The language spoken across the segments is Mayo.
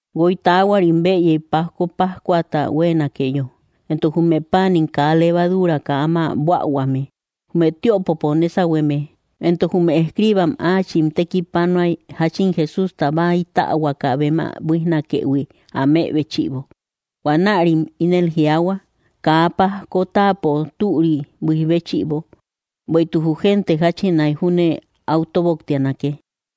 Guoi taahuarim bëyei pájko paskuata huenakeyo, éntok jume páanim kaa lévaduuraka áma buäbuame. Jume tiöpopo nésauhueme éntok jume escribam áachim tekipánoai jachin Jesústa báitähuaka bem ä buíjnakëhui ä më béchïbo. Huanärim ínel jiaahua: —Kaa pajko táapo türi buijbéchïbo, bueïtuk jü gente jachinaik júnne au tóboktianake.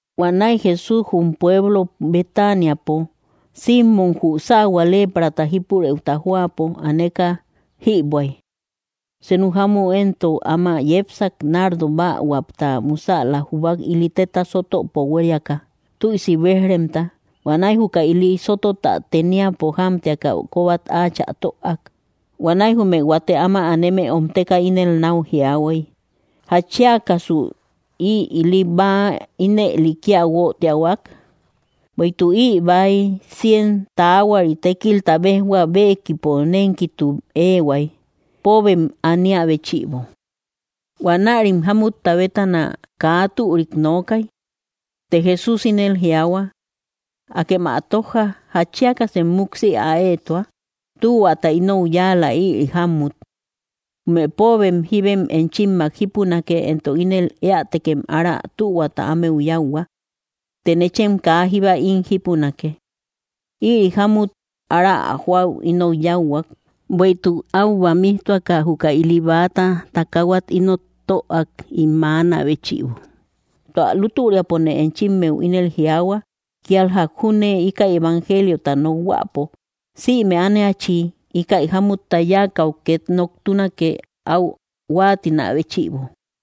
Huanäi Jesús jum pueblo Betániapo Simmom jü sähua leprata jípurëuta jóapo aneka jïbuäi. Senu jámmut éntok áma yépsak nardo bähuata musäla jubak ili teta sótöpo huériaka, tüisi béj‑remta. Huanäi juka ili sótöta teníapo jámtiaka, kóbat aachä töak. Huanäi jume huate áma aneme omteka ínel nau jiaahuay: —¿Jatchíakasu ï ili bäa ínëli kia guötiahuak? Bueïtuk ï bai cien taahuari tékilta bejhua béekipo nénkitu éehuai, póobem ania béchïbo. Huanärim jámutta bétana kaa türik nookai. Të Jesús ínel jiaahua: —Akem ä tojja. ¿Jatchíakasem muksi ä éetua? Tühuata inou yáala ïri jámmut. Jume póobem jibem enchimmak jípunake, éntok ínel éätekem ára tühuata ámeu yauhua; të nechem kaa jíba im jípunake. Ïri jámmut ára ä joäu inou yáuhuak, bueïtuk au bamijtuaka juka ili bäata takahuat ínot töak ín mäánä béchïbo. Tua lútüriapone enchimeu ínel jiaahua, kial jak júne íkäi evangeliota nokhuäpo, sïme ániachi, íkäi jámutta yáakäu ket noktúnake au huáatinä béchïbo.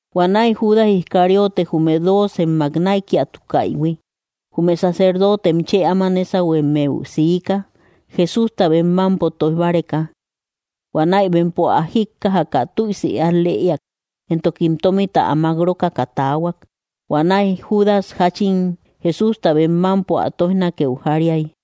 Huanäi Judas Iscariote, jume dóocemmak näikiatukähui, jume sacerdotem chë áma nésauhuemmeu siika, Jesústa bem mampo toij báreka. Huanäi bempo ä jíkkajakä tüisi al‑lëiak, éntokim tómita ä makrókakä taahuak. Huanäi Judas jachin Jesústa bem mampo ä tóijnakeu jaríai.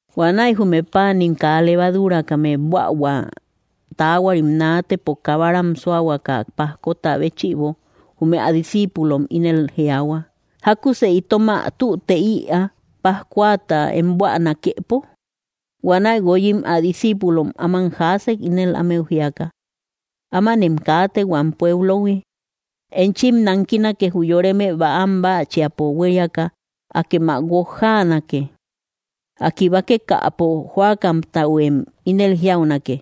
Huanäi jume páanim kaa lévadurakame buähuä taahuarim naatëpo, kabáram súahuakä pajkota béchïbo, jume ä discíipulom ínel au jiaahua: —¿Jákusë itom ä tütëïa pajkóata em buänakepo? Huanäi guoyim ä discíipulom áman jaasek ínel ámeu jíaka: —Ämanem kaate huam puéblohui. Enchim nankínake jü yoreme bäam bächiapo huériaka. Akem ä guojáanake. Ä kibákekäpo jóakamtauem ínel jiáunake: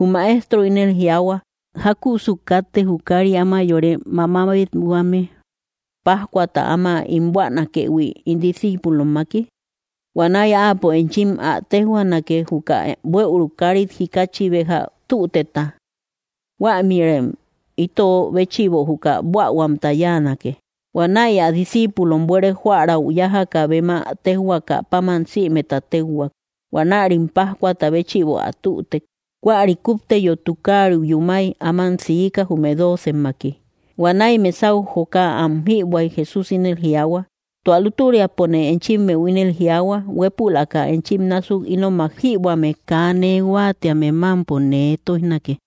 “Jü Maestro ínel jiaahua: ¿Jákusu káttek jü kari áma yore mamábethuame, pajkóata áma ín buanakëhui ín discíipulommaki?” Huanäi Áapo enchim ä téjhuanake juka buëuru kárit jikachi béja tüteta. Huämïrem ito béchïbo juka buähuamta yáanake. Huanäi ä discíipulom buere joaräu yájaka. Bem ä téjhuahuaka páman sïmeta téuhuak. Huanärim paskuata béchïbo ä tütek. Huäri kúpteyo, tukáriu yumái áman siikä jume dócemmaki. Huanäi mesáu jokä am jïbuäi, Jesús ínel jiaahua: —Tua lútüriapone enchimeu ínel jiaahua, huépülakä enchim násuk ínomak jïbuäme kaa nee huatíame mampone toijnake.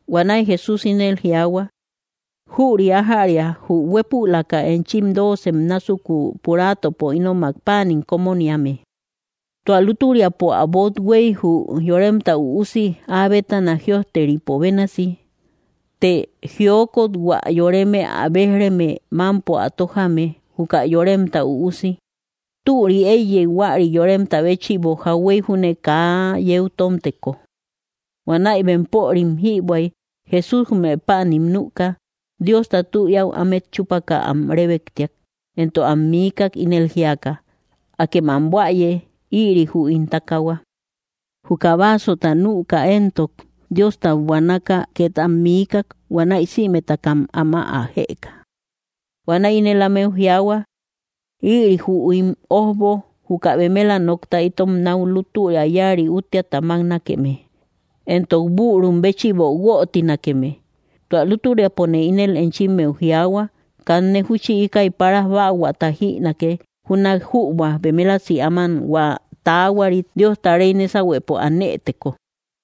Huanäi Jesús ínel jiaahua: —Jüri ájäria jü huépülaka enchim dóocem násuku puraatopo ínomak páanim kómoniame. Tua lútüriapo, ä böot huéiye jü Yoremta Üusi, ä bétana jïojteripo bénasi, të ¡jiokot hua yoreme ä bejreme mampo ä tojame juka Yoremta Üusi! Türi eiyei huäri yoremta béchïbo jahuéi júne kaa yeu tómteko. Huanäi bempörim jïbuäi, Jesús jume páanim nüka, Diosta tü eäu ámet chúpaka am rébektiak, éntok am miíkak ínel jíaka: —Akem am buäye; ïri jü ín takahua. Juka vásota nükä éntok Diostau buanaka, ket am miíkak, huanäi sïmetakam áma ä jëka. Huanäi ínel ámeu jiaahua: —Ïri jü ín ojbo, juka bemela nokta itom nau lútüria yáari útteata máknakeme, éntok bürum béchïbo guötinakeme. Tua lútüriapone ínel enchimeu jiaahua, kanne júchi íkäi páras bähuata jïnake júnak jübua bemélasi áman hua taahuarit Diosta rey nésahuepo anëteko.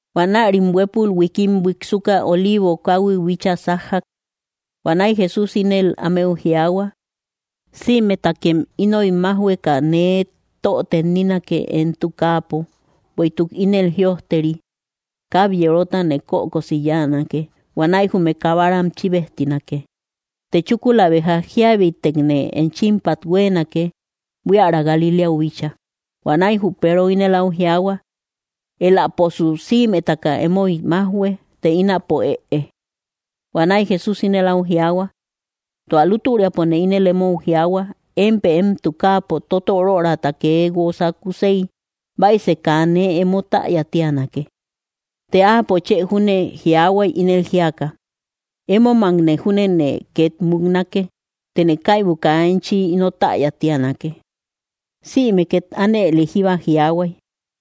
Huanärim huepul buikim buiksuka, Oliivo káuhuiu bíchaa sájjak. Huanäi Jesús ínel ámeu jiaahua: —Sïmetakem inoi májhueka nee töteénninake én tukáapo, bueïtuk ínel jïojteri: “Kabyerótane kökosi yáanake, huanäi jume kabáram chíbejtinake.” Të chúkula béja jíabitekne enchímpat huéenake buiära Galiléau bíchaa. Huanäi jü Peero ínel au jiaahua: —Éläposu sïmetaka emoi majhuë, të ínapo ëe. Huanäi Jesús ínel au jiaahua: —Tua lútüriapone ínel emou jiaahua, émpë, én tukáapo, totorörata kee guosa kuséi, baisë kaa nee emo täya tíanake. Të áapo chë júne jiaahuay ínel jíaka: —Émomak júnene ket muknake, tëne kaíbu kaa enchi ino täya tíanake. Sïme ket ánëli jíba jiaahuay.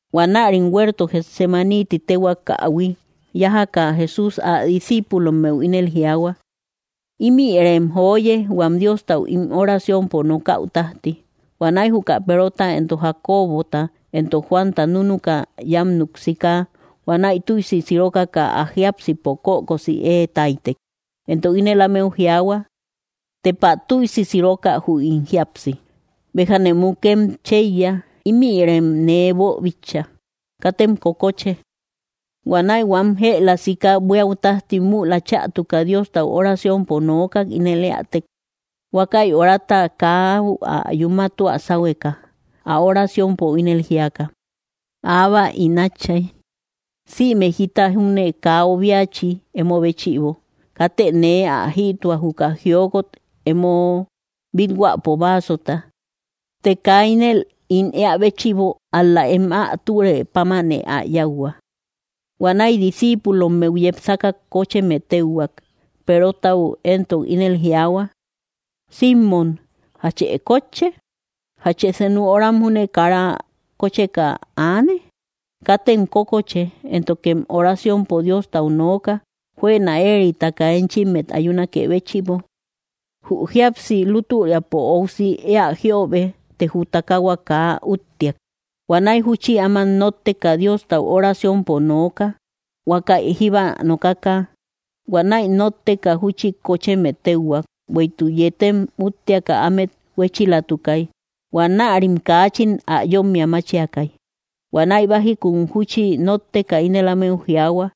Huanärim huerto Getsemaníu ti tehuakähui yájaka, Jesús ä discíipulommeu ínel jiaahua: —Ímirem joye huäm Diostau ín oraciompo nokäu tajti. Huanäi juka Perota, éntok Jacobota, éntok Juanta núnuka, yam núk siika, huanäi tüisi sirókaka ä jiápsipo kökosi eetaitek, éntok ínel ámeu jiaahua: —Tepa tüisi sirokä jü ín jíapsi. Béjane mukém cheiya. Ímirem nee boobíchaïhui. Katem kókoche. Huanäi huam jëla sika, buíau tajti mülaa chatuka Diostau oraciompo nookak: Ínel éätek huákäi orata kaa au ä yumátua sáhueka, ä oraciompo ínel jíaka: —Abba, ín Átchay, sïme jita júne kaa obíachi emo béchïbo. Katë nee ä jitua juka jiokot emo bit huapo vásota; të kaa ínel ín éä béchïbo, ál‑la em ä türë pámanë ä yauhua. Huanäi discíipulommeu yepsaka, kócheme téuhuak. Perotau entok ínel jiaahua: —Simmom, ¿jáchë kotche? ¿Jáchë senu oram júne kara kotcheka aane? Katem kókoche, éntokem oraciompo Diostau nooka juëna éerita kaa enchímet ayúnakë béchïbo. Jü jíapsi lútüriapo óusi éä jiöbe, të jü takahua kaa útteak. Huanäi júchi áman nótteka, Diostau oraciompo nookak, huakäi jíba nokaka. Huanäi nótteka, júchi kócheme téuhuak, bueïtuk yetem útteakä ámet huéchilatukai. Huanärim kaachin ä yommia máchiakai. Huanäi bájikun júchi nótteka, ínel ámeu jiaahua: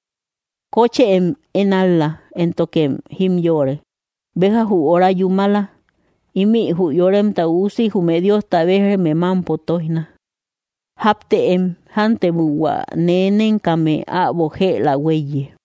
—Kóchëem én ál‑la, éntokem jimyore. Béja, jü ora yúmala. Ímï, jü Yoremta Üusi jume Diosta bejreme mampo toijna. Jáptëem, jántebu: hua nee nénkakame äbo jëla huéiye.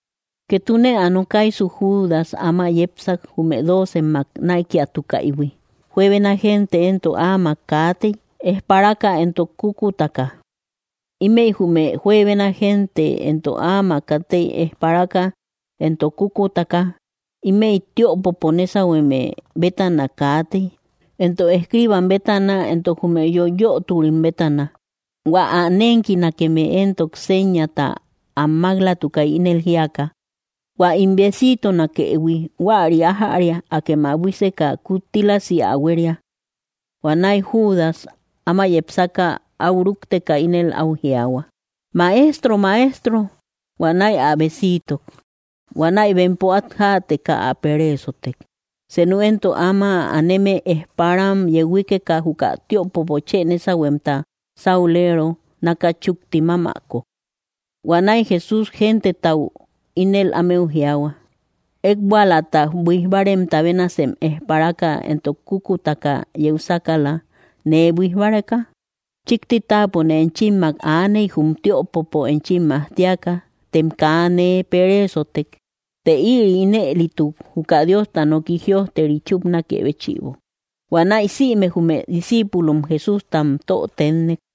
Ketune ä nokaisu Judas áma yépsak, jume dóocemmak näikiatukaïhui. Juebena gente éntok áamak kaatei esparaka éntok kúkutaka. Ímëi jume juebena gente éntok áamak kaatei esparaka entok kúkutaka. Ímëi tiöpopo nésauhueme bétana kaatei, éntok escribam bétana, éntok jume yoiyöturim bétana. Huä ä nénkinakeme éntok séñata am máklatukai ínel jíaka: —Huä ín besíitonakëhui, huäri ájäria; akem buíseka, kuttílasi ä huéria. Huanäi Judas áma yepsaka, au rúkteka ínel au jiaahua: —Maestro, Maestro. Huanäi ä besíitok. Huanäi bempo at jaateka ä peréesotek. Senu éntok áma aneme ejparam yeu huíkeka juka tiöpopo chë nésauhuemta sauleero nakä chukti mámäkok. Huanäi Jesús gentetau ínel ámeu jiaahua: —¿Ékbualata buij báaremta bénasem esparakä éntok kúkutaka yeu sákala nee buij báreka? Chikti táapone enchimmak aaney jum tiöpopo enchim majtíaka, tem kaa nee peréesotek. Të ïri ínëlituk juka Diosta noki jïojteri chúpnakë béchïbo. Huanäi sïme jume discíipulom Jesústam töténnek.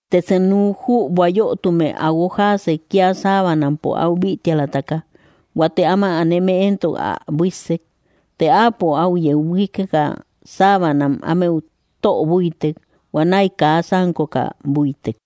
Të senu jübua yötume ä guojáasek kia sábanampo au bïtialataka, huate áma aneme éntok ä buíssek; të áapo au yeu huíkeka sábanam ámeu töbúitek. Huanäi kaa sánkokä búitek.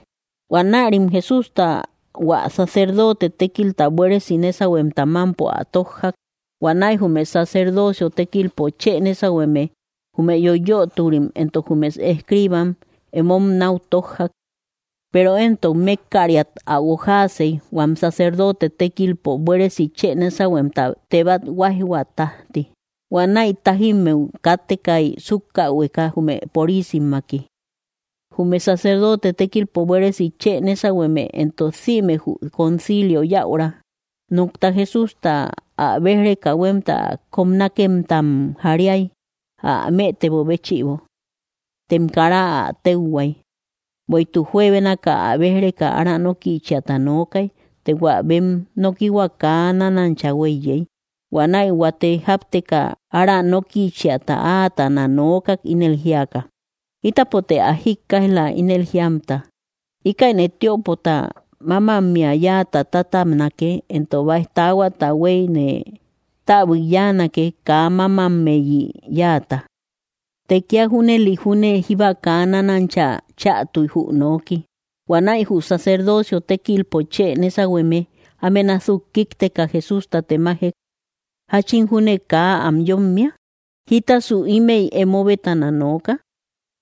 Huanärim Jesústa hua sacerdote tékilta buéresi nésahuemta mampo ä tojjak. Huanäi jume sacerdosio tékilpo chë nesahueme, jume yoiyöturim, éntok jume escribam emom nau tojjak. Peero éntok mékkäriat ä guojáasei huam sacerdote tékilpo buéresi chë nésahuemta tebat huaijhua tajti. Huanäi tájimmeu kátekai súkkähueka jume porisimmaki. Jume sacerdote tékilpo buéresi chë nésauhueme éntok sïme jü concilio yäura; nokta Jesústa ä bej‑reka huemta ä kobnákemtam jariai, ä mëtebo béchïbo; tem kara ä teuhuai. Bueïtuk juebenakä ä béjreka aranókïchiata nookai, të hua bem nokihua kaa nánancha hueiyei. Huanäi huate jápteka, aranókïchiata áatana nookak ínel jíaka: —Ítapote ä jkíkkaijla ínel jiamta: “Íkäine tiöpota mámammea yáata tátabnake, éntok baij taahuata hueine täbuik yáanake kaa mámammeyi yáata.” Të kia junëli júne jíba kaa nánancha chätui jü nooki. Huanäi jü sacerdosio tékilpo chë nésauhueme áme násuk kíkteka, Jesústa temajek: —¿Jachin júne kaa am yommia? ¿Jítasu ímëi émo bétana nooka?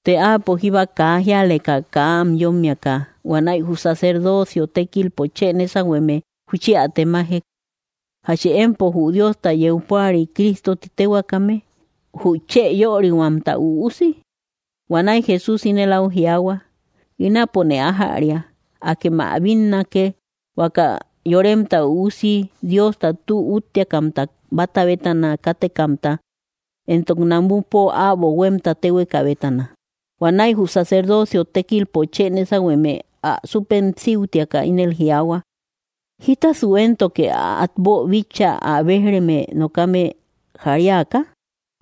Të Áapo jíba kaa jíaleka. Kaa am yommiak. Huanäi jü sacerdosio tékilpo chë nésauhueme júchi ä temajek: —¿Jache empo jü Diosta yeu púari Cristo titéhuaakame, jü chë Yörihuamta Üusi? Huanäi Jesús ínel au jiaahua: —Ínapone ájäria. Akem ä bínnake huaka Yoremta Üusi Dios tua útteakamta bata bétana kátekamta, éntok namupo äbo huemta téhueka bétana. Huanäi jü sacerdosio tékilpo chë nésauhueme ä supem siutiaka ínel jiaahua: —¿Jítasu éntokte at boobinnake ä bejreme nokame jariaka?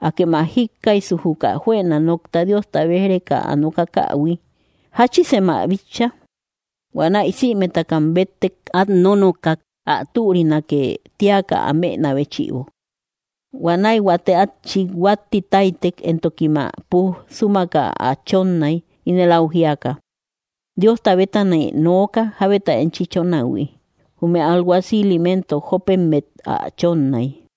Akem ä jikkaijsuk juka juena nokta Diosta bej-reka ä nokakähui, ¿jachisem ä bitcha? Huanäi sïmetakam bettek at nonokak, ä türinake tiaka ä mëna béchïbo. Huanäi huate at chit huatti taitek entokim ä puj summaka ä chonnay, ínel au jiaka: —¡Diosta bétane nooka jabeta enchi chonähui! Jume alguacilim entok jopemmet ä chonnai.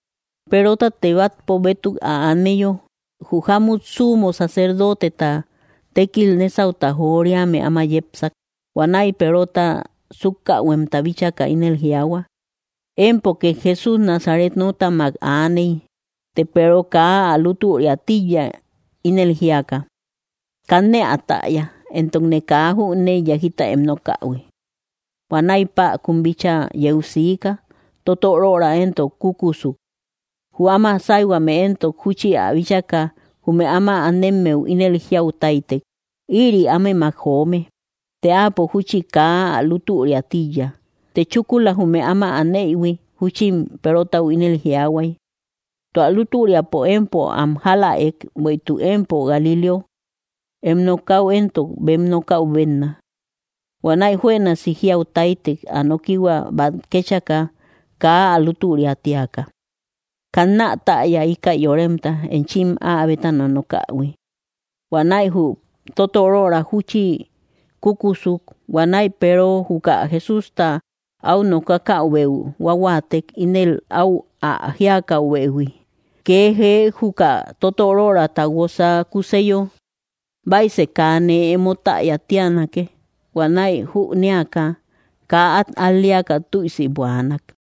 Perota tebatpo bétuk ä aaneyo, jü jamut sumo sacerdoteta, tékil nésauta joriame áma yepsak. Huanäi Perota sukkahuemta bíchaka ínel jiaahua: —Empo ket Jesús Nazarenotamak aaney. Të Peero kaa ä lútüria tíiya ínel jiaka: —Kanne ä täya, éntokne kaa jüneiya jita em nokähui. Huanäi pakun bíchaa yeu sika, totoröra entok kukusuk. Jü áma saihuame entok júchi ä bíchaka, jume áma aanemmeu ínel jiautáitek: —Ïri ámemak joome. Të áapo júchi kaa ä lútüria tíiya, të chúkula jume áma anëihui júchim Perotau ínel jiaahuay: —Tua lútüriapo empo am jáläek, bueïtuk empo Galileo; em nokaü entok bem nokaü benna. Huanäi juënasi jiautáitek, ä nokihua bat kechaka kaa ä lútüria tiaka: —Kannä täya íkäi yoremta enchim áa bétana nokähui. Huanäi jü totoröra júchi kúkusuk. Huanäi Peero juka Jesústa au nokákäubeu huahuáatek ínel au ä jíakäubehui: “Kee jee juka totorörata guosa kúseyo, baisë kaa nee emo täya tíanake.” Huanäi jünéaka, kaa at al‑lëakä tüisi buaanak.